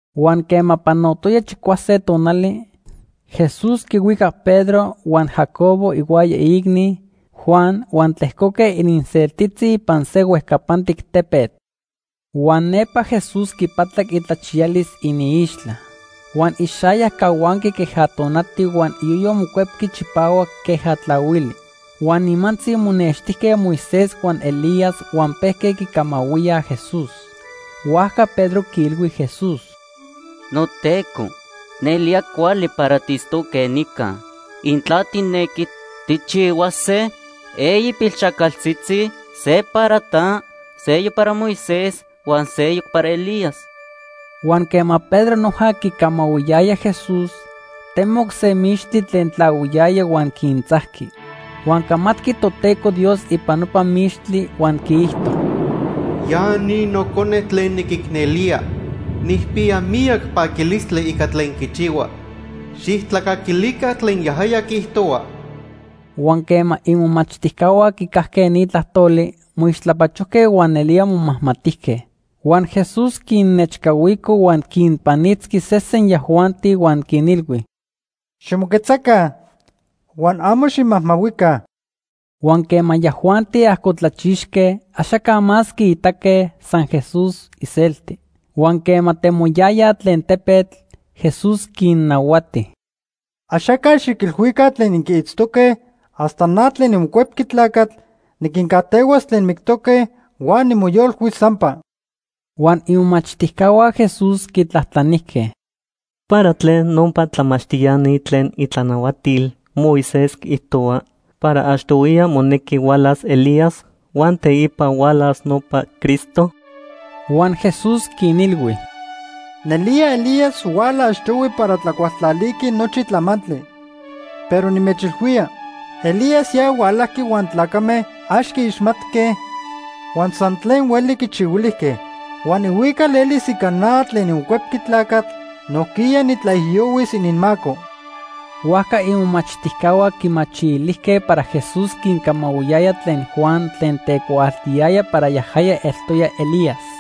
Huan quema panotoya chicuase tonali, Jesús quihuicac Pedro huan Jacobo ihuaya iicni, Juan, huan tlejcoque ininseltitzi ipan se huejcapantic tepetl. Huan nepa Jesús quipatlac itlachiyalis iniixtla. Huan ixayac cahuanqui queja tonati huan iyoyo mocuepqui chipahuac queja tlahuili. Huan nimantzi monextijque Moisés huan Elías huan pejque quicamahuíaj Jesús. Huajca Pedro quiilhui Jesús: ―NoTeco, nelía cuali para tiitztoque nica. Intla tijnequi, tijchihuase eyi pilxajcaltzitzi. Se para ta, seyoc para Moisés huan seyoc para Elías. Huan quema Pedro noja quicamahuiyaya Jesús, temoc se mixtli tlen tlahuiyaya huan quintzajqui. Huan camatqui Toteco Dios ipan nopa mixtli huan quiijto: “Ya ni Nocone tlen niquicnelía. Nijpiya miyac paquilistli ica tlen quichihua. Xijtlacaquilica tlen yajaya quiijtohua.” Huan quema imomachtijcahua quicajque ni tlajtoli, moixtlapachojque huan nelía momajmatijque. Huan Jesús quinnechcahuico huan quinpanitzqui sesen yajuanti huan quinilhui: ―Ximoquetzaca huan amo ximajmahuica. Huan quema yajuanti ajcotlachixque, axaca más quiitaque, san Jesús iselti. Huan quema temoyayaj tlen tepetl, Jesús quinnahuati: ―Axaca xiquilhuica tlen inquiitztoque hasta na tlen niMocuepqui Tlacatl niquincajtehuas tlen mictoque huan nimoyolcuis sampa. Huan imomachtijcahua Jesús quitlajtlanijque: ―¿Para tlen nopa tlamachtiani tlen itlanahuatil Moisés quiijtohuaj para achtohuiya monequi hualas Elías huan teipa hualas nopa Cristo? Huan Jesús quinilhui: ―Nelía Elías huala achtohui para tlacualtlaliqui nochi tlamantli. Pero nimechilhuía, Elías ya hualajqui huan tlacame ax quiixmatque huan san tlen hueli quichihuilijque. Huan ihuical elis ica na tlen niMocuepqui Tlacatl nojquiya nitlaijiyohuis ininmaco. Huajca imomachtijcahua quimachilijque para Jesús quincamahuiyaya tlen Juan tlen tecuaaltiyaya para yajaya eltoya Elías.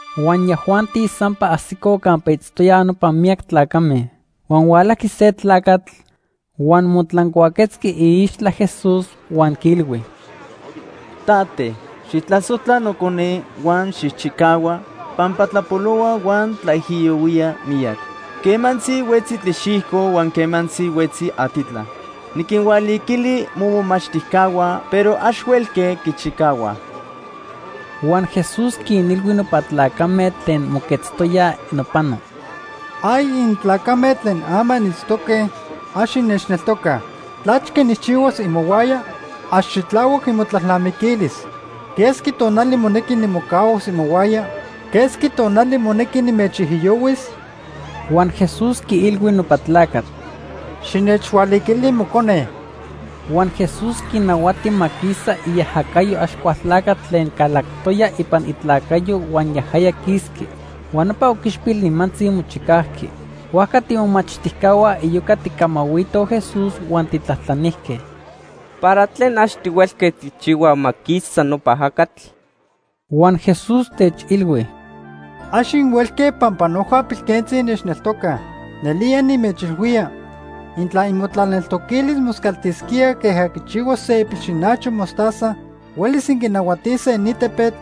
Huan yajuanti sampa ajsicoj campa itztoyaj nopa miyac tlacame. Huan hualajqui se tlacatl, huan motlancuaquetzqui iixtla Jesús huan quiilhui: ―Tate, xijtlasojtla nocone huan xijchicahua pampa tlapolohua huan tlaijiyohuía miyac. Quemantzi huetzi tlixijco huan quemantzi huetzi atitla. Niquinhualiquili momomachtijcahua pero ax huelque quichicahuaj. Huan Jesús quinilhui nopa tlacame tlen moquetztoyaj nopano: ―¡Ay intlacame tlen ama initztoque, ax innechneltocaj! ¿Tlachque nijchihuas imohuaya? Ax xitlahuac imotlalnamiquilis. ¿Quesqui tonali monequi nimocahuas imohuaya? ¿Quesqui tonali monequi nimechijiyohuis? Huan Jesús quiilhui nopa tlacatl: ―Xinechhualiquili mocone. Huan Jesús quinahuati ma quisa iajacayo Axcualtlacatl tlen calactoya ipan itlacayo huan yajaya quisqui. Huan nopa oquichpil nimantzi mochicajqui. Huajca tiimomachtijcahua iyoca tijcamahuitoj Jesús huan tijtlajtlanijque: ―¿Para tlen ax tihuelque tijchihuaj ma quisa nopa ajacatl? Huan Jesús techilhui: ―Ax inhuelque pampa noja pilquentzi innechneltocaj. Nelía nimechilhuía, intla imotlaneltoquilis moscaltisquía queja quichihua se ipilxinacho mostaza, huelis inquinahuatise ni tepetl: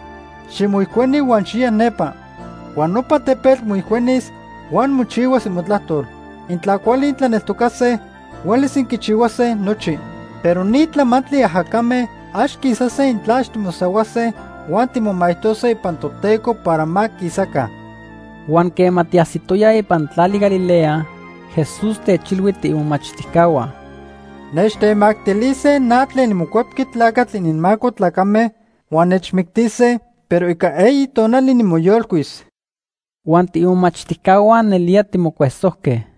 ‘Ximoijcueni huan xiya nepa’ huan nopa tepetl moijcuenis huan mochihuas imotlajtol. Intla cuali intlaneltocase, huelis inquichihuase nochi. Pero ni tlamantli ajacame ax quisase intla ax timosahuase huan timomaijtose ipan Toteco para ma quisaca. Huan quema tiajsitoyaj ipan tlali Galilea, Jesús techilhui tiimomachtijcahua: ―Nechtemactilise na tlen niMocuepqui Tlacatl ininmaco tlacame, huan nechmictise, pero ica eyi tonali nimoyolcuis. Huan tiimomachtijcahua nelía timocuesojque.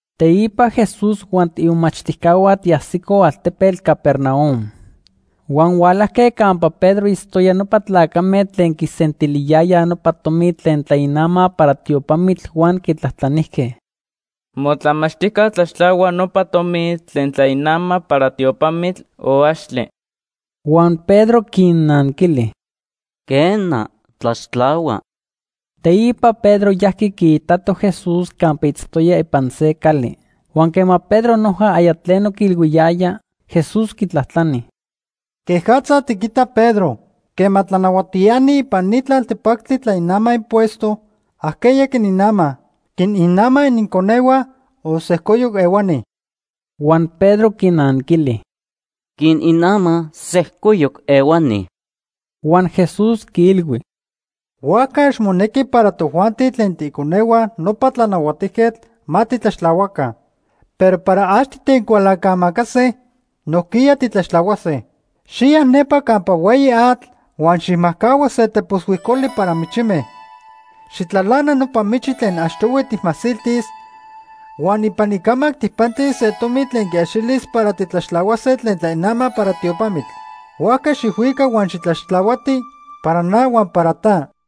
Teipa Jesús huan tiimomachtijcahua tiajsicoj altepetl Capernaum. Huan hualajque campa Pedro itztoya nopa tlacame tlen quisentiliyayaj nopa tomi tlen tlainamaj para tiopamitl huan quitlajtlanijque: ―¿Motlamachtijca tlaxtlahua nopa tomi tlen tlainamaj para tiopamitl o axtle? Huan Pedro quinnanquili: ―Quena, tlaxtlahua. Teipa Pedro yajqui quiitato Jesús campa itztoya ipan se cali. Huan quema Pedro noja aya tleno quiilhuiyaya, Jesús quitlajtlani: ―¿Quejatza tiquita, Pedro? Quema tlanahuatiani ipan ni tlaltepactli tlainamaj impuesto, ¿ajqueya quininamaj? ¿Quininamaj ininconehua o sejcoyoc ehuani? Huan Pedro quinanquili: ―Quininamaj sejcoyoc ehuani. Huan Jesús quiilhui: ―Huajca ax monequi para tojuanti tlen tiiconehua nopa tlanahuatijquetl ma titlaxtlahuaca. Pero para ax titecualancamacase, nojquiya titlaxtlahuase. Xiya nepa campa hueyi atl huan xijmajcahua se tepos huijcoli para michime. Xijtlalana nopa michi tlen achtohui tijmasiltis, huan ipan icamac tijpantis se tomi tlen quiaxilis para titlaxtlahuase tlen tlainamaj para tiopamitl. Huajca xijhuica huan xitlaxtlahuati para na huan para ta.